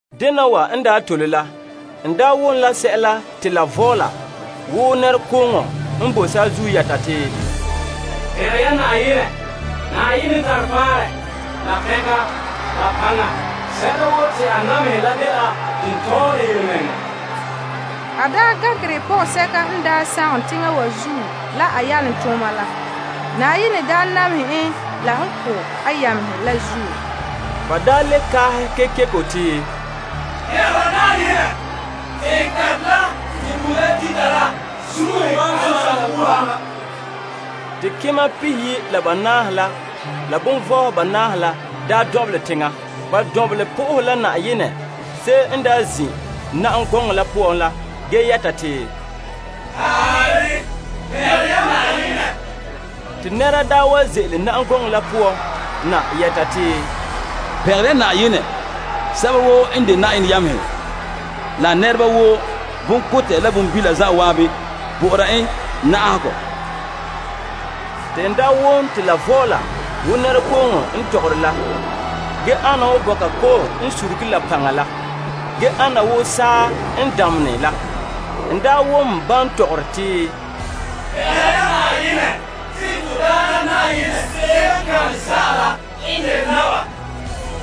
Dena wa n tole la, n wom la sɛla te la vɔɔla wo nɛrekooŋɔ n boe saazuo yɛta yeti, Pɛngɛ ya Yenɛ! Yenɛ n tare faanrɛ la soŋa la paŋa. Sɛla woo te a namehɛ la dela tontɔɔ la yelemɛŋɛrɛ. A gankerɛ pɔgɔsɛka n daa sagom teŋa wa zuo la a yalomtooma la. Yenɛ daa namehɛ en la n ko' a yamehe la zuo. Ba le kaahɛ kekeko yeti, Pɛngɛ ya Yenɛ! Teŋkantɛ la te bugum la dita la zun'uhe wan zon ha wuuha. Te kema pihiyi' la banaahe la la kelompagehedoma banaahe la lu' teŋa. Ba lu' na'aha Yenɛ se'em n zin' na'am gɔŋɔ la poan la ge yɛta yeti, Taarɛ, pɛngɛ ya Yenɛ. Te nɛra wa ze'ele na'am gɔŋɔ la poan na yɛta yeti, Pɛngɛ ya Yenɛ sɛba woo n de Yenɛ yamehe, la a nɛreba woo, bonkotɛ la bonbila zan'an bɔ'ɔra en na'ahegɔ la. Te n wom te la vɔɔla wo nɛrekooŋɔ n tɔgɔre la ana wo bɔka kɔ'ɔn n surugere la paŋa la ge ana wo saa n damenɛ la. N wom ban tɔgɔre te, Pɛngɛ ya Yenɛ! Te Pɛɛntɛɛnreba Na'ayenɛ to Yenɛ Na'ayenɛ n de naba.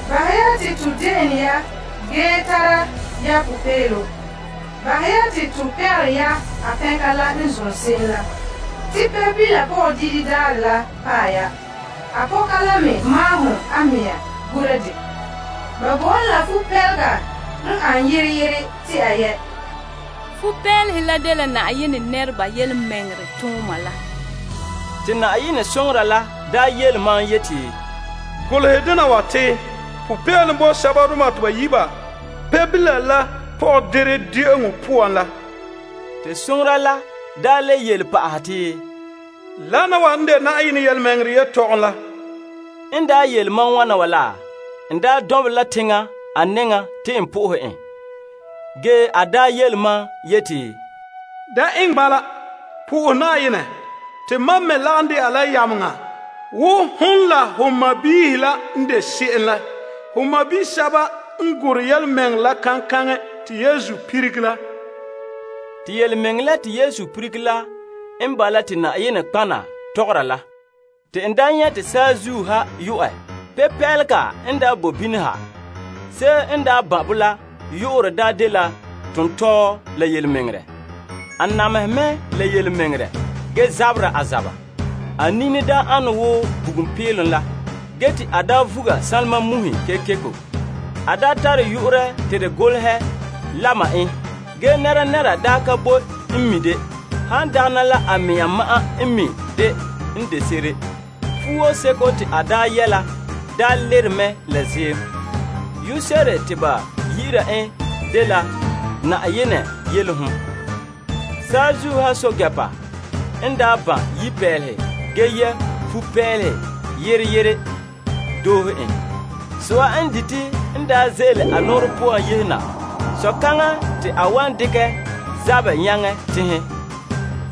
Bahɛ ya te to de'ene ya ge tara ya popeelom. Bahɛ ya te to pɛngɛ ya a kantɛ la n zom se'em la. Te Pebila pɔgɔdire dabaherɛ la paɛ ya. A pɔka la me maahom a mea gura dɛ. Ba bo ka la fupeelehe n an yere yere te a yɛ'. Fuo ane fa'a la dela Yenɛ nɛreba yelemɛŋɛrɛ tooma la. Te Yenɛ soŋora la yele mam yeti, Golehɛ dena wa te, Popeelom bo sɛbadoma te ba yi' ba Pebila la pɔgɔdire de'eŋɔ poan la. Te soŋora la daa le yele pa'ahɛ te, Wana wa n de Yenɛ yelemɛŋɛrɛ yelehom la. N yele mam wana wa la, n lu' na'mai te n na'ahe en. Ge a yele mam yeti, Da eŋɛ bala. Na'ahe Yenɛ. Te mam me lagom de'a la yameŋa woo, hon la ho sɔɔnrɔ la n de se'em la. Ho sɔɔnrɔ sɛba n gorɛ yelemɛŋɛrɛ la kaŋkaŋɛ te Yesu lilige la. Te yelemɛŋɛrɛ la te Yesu lilige la n bala te nɔtɔgɔheba tɔgɔra la. Te n nyɛ' te saazuo ha yu'ɛ. Yepeelega n boe bini ha. Se'em n ban' bo la yu'urɛ daa dela birikina la Yelemɛŋɛrɛ. A namehe mɛ la yelemɛŋɛrɛ ge zabera a zaba. A nini an wo bugum peelom la, ge te a vuga sanlema muhe kekeko. A tare yu'urɛ te de golehɛ lama en. Ge nɛnɛra ka boe n mi' de, han dagɛna la a mɛŋa ma'an n mi' de. Fuo seko te a yɛ' la daa lerom mɛ la ziim. Yu'urɛ se'ere te ba yi'ira en dela Yenɛ Yelehom. Saazuo ha pɛɛntɛɛnreba n ban' yipeelehe ge yɛ' fupeelehe yere yere doohe en. So'a n dite n ze'ele a nɔɔrɛ poan yehe na. So'kaŋa te a wan dekɛ zabɛ nyaŋɛ tenhen.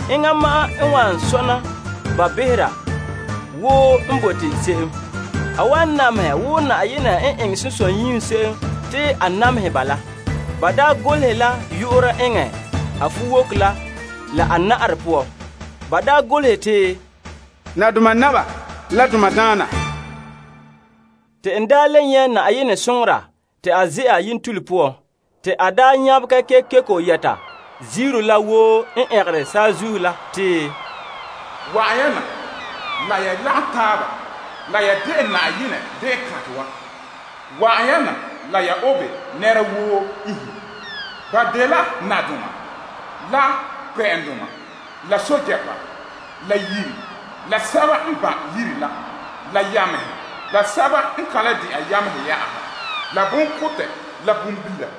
A wan wɔnrɛ ba la kuto doore. A wan namehɛ wo Gaŋɛ Zan'an Yenɛ eŋɛ sunsunyiim se'em te a namehɛ ba la. Ba golehɛ la yu'urɛ eŋɛ a fuwoko la la a na'arɛ poan. Ba golehɛ te, nadoma Naba la daandoma Daana. Te n le nyɛ' Yenɛ soŋora te a ze'a yentule poan. Te a nyabegɛ kekeko yɛta ziiro la woo n ɛngere saazuo la te, Wa'an ya na la ya lagom taaba la ya de'eŋ Yenɛ de'eŋkantɛ wa. Wa'an ya na la ya obe nɛra woo iinhe. Ba dela nadoma la kpɛ'ɛndoma la pɛɛntɛɛnreba la yiri la sɛba n ban' yiri la la yamehe la sɛba n ka le de'a yamehe yɛ'ɛha la, bonkotɛ la bonbila.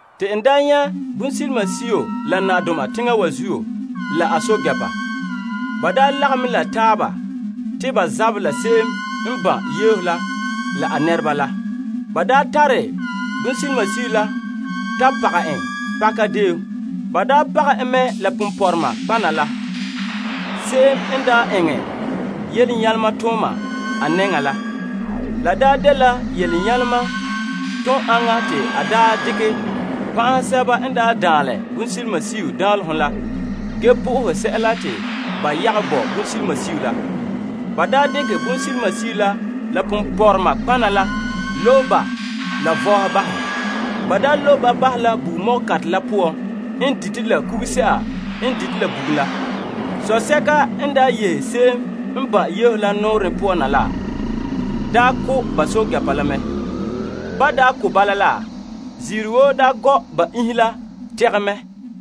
Te n nyɛ' bonsilimasio la nadoma teŋa wa zuo, la a pɛɛntɛɛnreba. Ba lagom la taaba te ba zabɛ la se'em n ban' yeho la la a nɛreba la. Ba nyɔkɛ bonsilimasio la mɛ. Ba nyɔkɛ en mɛ la nɔtɔgɔha ponpɔrɔŋdoma la, se'em n eŋɛ yelenyalema tooma a nɛŋa la. La dela yelenyalema toon aŋa te a daa dekɛ pan'ahɛ sɛba n daa daanlɛ bonsilimasio danlehom la ge na'ahe sɛla te ba yagom bo bonsilimasio la. Ba dekɛ bonsilimasio la la nɔtɔgɔhɔ ponpɔrɔma la lobe ba la vore bahɛ. Ba lobe ba bahɛ la bugum ko'kantɛ la poan n dite la kuguse'a n dite la bugum la. Sosɛka n yehe se'em n ban' yeho la nɔɔrɛ poan na la, ko' ba pɛɛntɛɛnreba la mɛ. Ba daa ko' bala la, ziiro woo daa gɔ' ba iinhe la tegɛ mɛ.